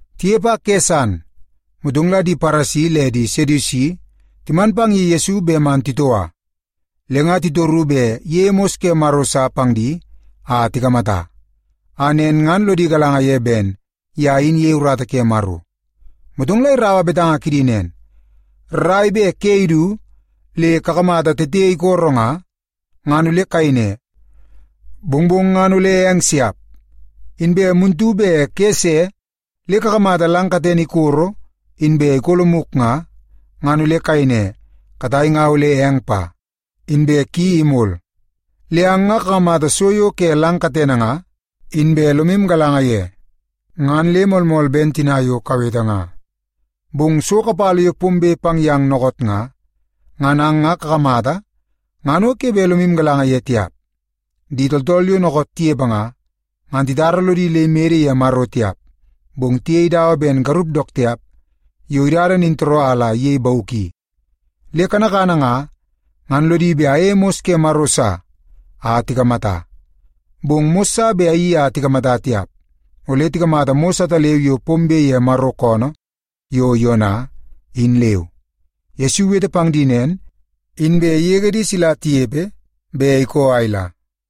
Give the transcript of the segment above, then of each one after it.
Tinepe a kene san, motong la di Paresi le di Sedusi timan pang ye Yesu bet man titoua. Le nga titoru bet iyeie mos ke Maro sa pang di a tikamata, a nen ngan lodi galanga ye ben ye in iyei urata ke Maro. Motong la iraua betanga kidi nen, “Rrai bet ke idu le kakamata tete ikororo nga, ngan ole kayei ne, ‘Mongmong ngan ole eng siap.’ Inbe muntu bet ke ise le kakamata lang katene ikoro inbe ikolomuk nga, ngan ole kayei ne, ‘Katai nga ole eng pa, inbe ki imol.’ Le ang nga kakamata so yo ke lang katene nga, inbe lomu galanga ye, ngan le moolmool ben tina yo kawete nga. Bong so kapala yo pombe pang yang dookoot nga, ngan ang nga kakamata ngan o ke bet lomu galanga ye tiap. Di tooltool yo dookoot tinepe nga, ngan titara lodi le imede ye Maro tiap, bong tiyei dawa ben garup dook tiap yo idada nintooroo a la iyei bauk i. Le kanakana nga, ngan lodi bet ayeie mos ke Maro sa a tikamata. Bong mos sa bet ayeii a tikamata tiap. Ole tikamata mos ataleu yo pombe ye Maro koonoo yo Yona, in leu.” Yesu iwete pang di nen, inbe igege di sila tinepe, be ikoo a ila.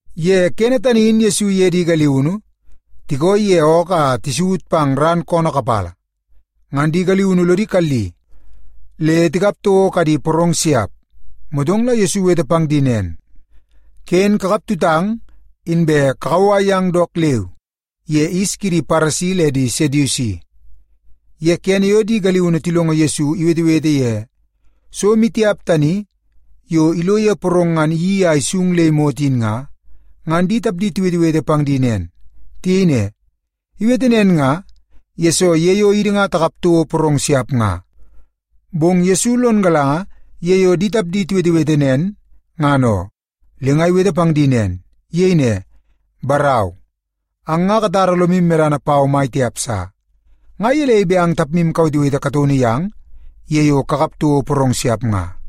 Ye kene tani in Yesu iye di galiunu tikooi ye ookoo a tisaut pang ran koonoo kapala, ngan di galiunu lodi kalli le tikap toko kadi porong siap. Motong la Yesu iwete pang di nen, “Ken kakap tutang, inbe kakauwai yang dook leu ye yis kidi Paresi le di Sedusi.” Ye kene yo di galiunu tilongo Yesu iwetewete ye so maitiap tani yo ilo ye porong ngan iyeii a isung le imot in nga, ngan di tapdi tiwetewete pang di nen. Tiyei ne, “Iwete nen nga, yesoo ye yo idi nga takap toko porong siap nga.” Bong Yesu lon galanga ye yo di tapdi tiwetewete nen, ngan oo, le nga iwete pang di. Iyei ne, “Barau, ang nga katara lomu medana pau mai tiap sa. Nga gelei bet ang tapmu kawetewete kataunu yang ye yo kakap toko porong siap nga?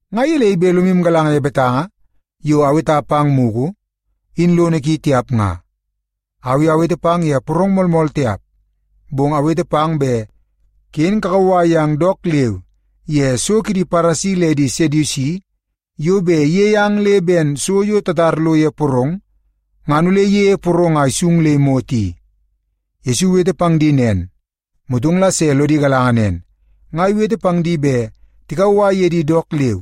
Nga gelei bet lomu galanga ye betanga yo aweta pang mugu, in lono ki tiap nga? Au i awete pang ye porong moolmool tiap. Bong awete pang bet ken kakauwai yang dook leu ye so kidi Paresi le di Sedusi yo bet iyei ang le ben so yo tatar lo ye porong, ngan ole iyeie porong a isung le imot i.” Yesu iwete pang di nen, motong la se lodi galanga nen, nga iwete pang di bet tikauwai ye di dook leu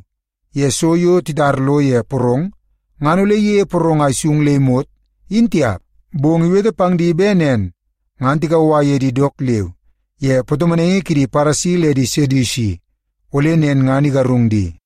ye so yo titar lo ye porong ngan ole iyeie porong a isung le imot, in tiap. Bong iwete pang di bet nen ngan tikauwai ye di dook leu ye patomonaingi kidi Paresi le di Sedusi ole nen ngan igarung di.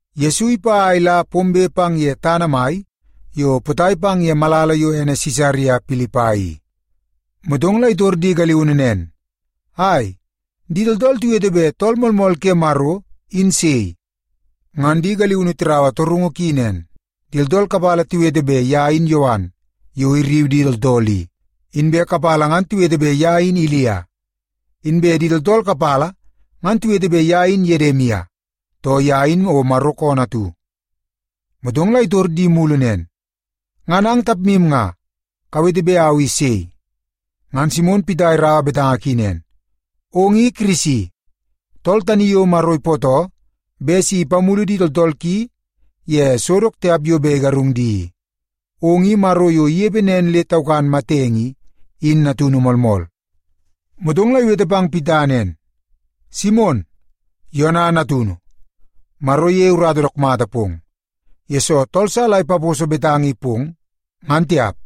Yesu ipa a ila pombe pang ye tana mai yo potai pang ye malala yo ene Sisaria Pilipai i, motong la itor di galiunu nen, “Ai, di tooltool tiwete bet Tool Moolmool ke Maro in sei?” Ngan di galiunu tiraua torungu ki nen, “Di tooltool kapala tiwete bet ye in Yowan yo irriu di tooltool i, inbe di kapala ngan tiwete bet ye in Ilia. Inbe di tooltool kapala ngan tiwete bet ye in Yedimia, too ye in o Maro koonoo atu.” Motong la itor di mulu nen, “Ngan ang tapmu nga, kawete bet au i sei?” Ngan Simon Pita iraua betanga ki nen, “Ong i Kirisi, tool tani yo Maro ipootoo bet si ipamulu di tooltool ki ye so dook tiap yo bet igarung di i. Ong i Maro yo inepe nen le taukan matenge i, in natunu moolmool.” Motong la iwete pang Pita nen, “Simon, Yona natunu, Maro iyeie urata dook mata pong, yesoo tool sa la ipaposo betanga i pong, ngan tiap.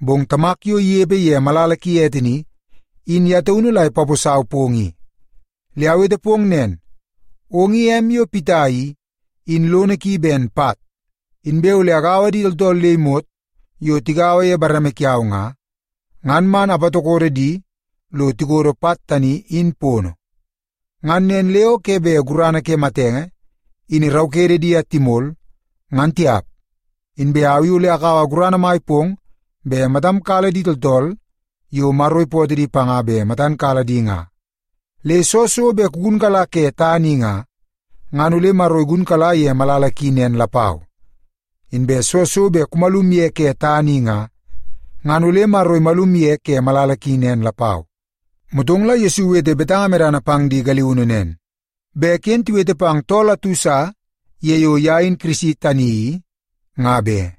Bong Tamak yo inepe ye malala ki ete ni, in ye taunu la ipaposau pong i. Le awete pong nen, ong i em yo Pita i, in lono ki ben pat. Inbe ole agaua di tooltool le imot yo tigaua ye bareme kiau nga, ngan man apatokodo di lo tikodo pat tani, in pono. Ngan nen le o ke bet gurana ke matenge in iraukede di a timol, ngan tiap. Inbe au i ole akaua gurana mai pong bet matam kala di tooltool yo Maro ipootoo di panga bet matan kala di nga. Le soo so bet kugunkala ke tana i nga, ngan ole Maro igunkala ye malala ki nen lapau. Inbe soo so bet kumalum ye ke tana i nga, ngan ole Maro imalum ye ke malala ki nen lapau.” Motong la Yesu iwete betanga medana pang di galiunu nen, bet ken tiwete pang tool atu sa ye yo ye in Kirisi tani i, nga be.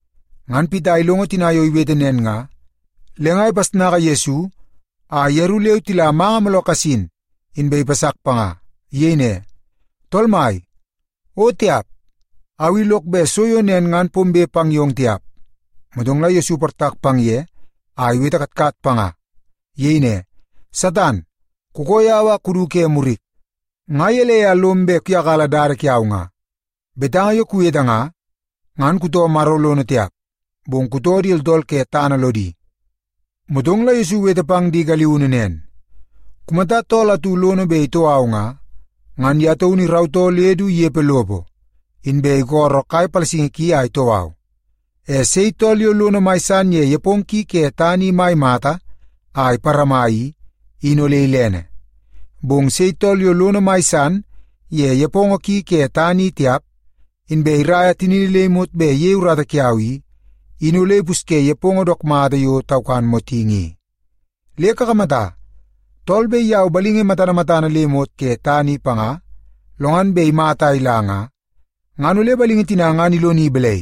Ngan Pita ilongo tina yo iwete nen nga, le nga ipasnaka Yesu a yeru leu tila manga mooloo kasin, inbe ipasak panga. Iyei ne, “Tool Mai, o tiap! Au i lok bet so yo nen ngan pombe pang yong tiap!” Motong la Yesu iportak pang ye a iwete katkat panga. Iyei ne, “Satan, kukoo yau a kudu ke murik! Nga gelei a lom bet kuyakala dada kiau nga? Betanga yo kuwete nga, ngan kutoo Maro lono tiap, bong kutoo di tooltool ke tana lodi.” Motong la Yesu iwete pang di galiunu nen, “Kumata tool atu lono bet itoo au nga, ngan ye taunu irautoo le du inepe lopo, inbe isolo kai palasingi ki a itoo au. E sei tool yo lono mai san ye nepongo ki ke tana i mai mata a iparama i, in ole ilene. Bong sei tool yo lono mai san ye nepongo ki ke tana i tiap, inbe iraia tinini le imot bet iyei urata kiau i, in ole ipusye nepongo dook mata yo taukan motingi i. Le kakamata, tool bet iyau balingi matana matana le imot ke tana i panga, lo ngan bet imata a ila nga, ngan ole balingi tina ngan iloni balai?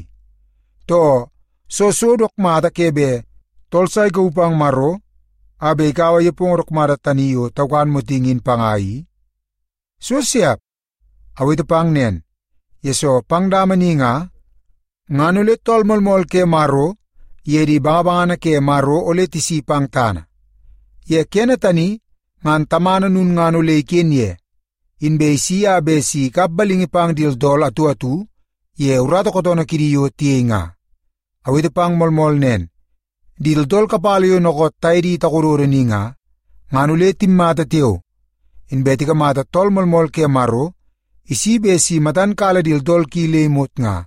Too, soo so dook mata ke bet tool sa ikauu pang Maro a bet ikaua nepongo dook mata tani yo taukan motingi in panga i? So siap! Awete pang nen, yesoo pang dama ni nga, ngan ole Tool Moolmool ke Maro iye di bangabangana ke Maro ole tisi pang tana. Ye kene tani ngan Tamana lulngana ole iken ye, inbe isi a bet si ikap balingi pang di tooltool atu atu ye urata kootoonoo kidi yo tiyei nga. Awete pang moolmool nen, di tooltool kapala yo dookoot taye di takododo ni nga, ngan ole timmata tiao, inbe tikamata Tool Moolmool ke Maro isi bet si matan kala di tooltool ki le imot nga.”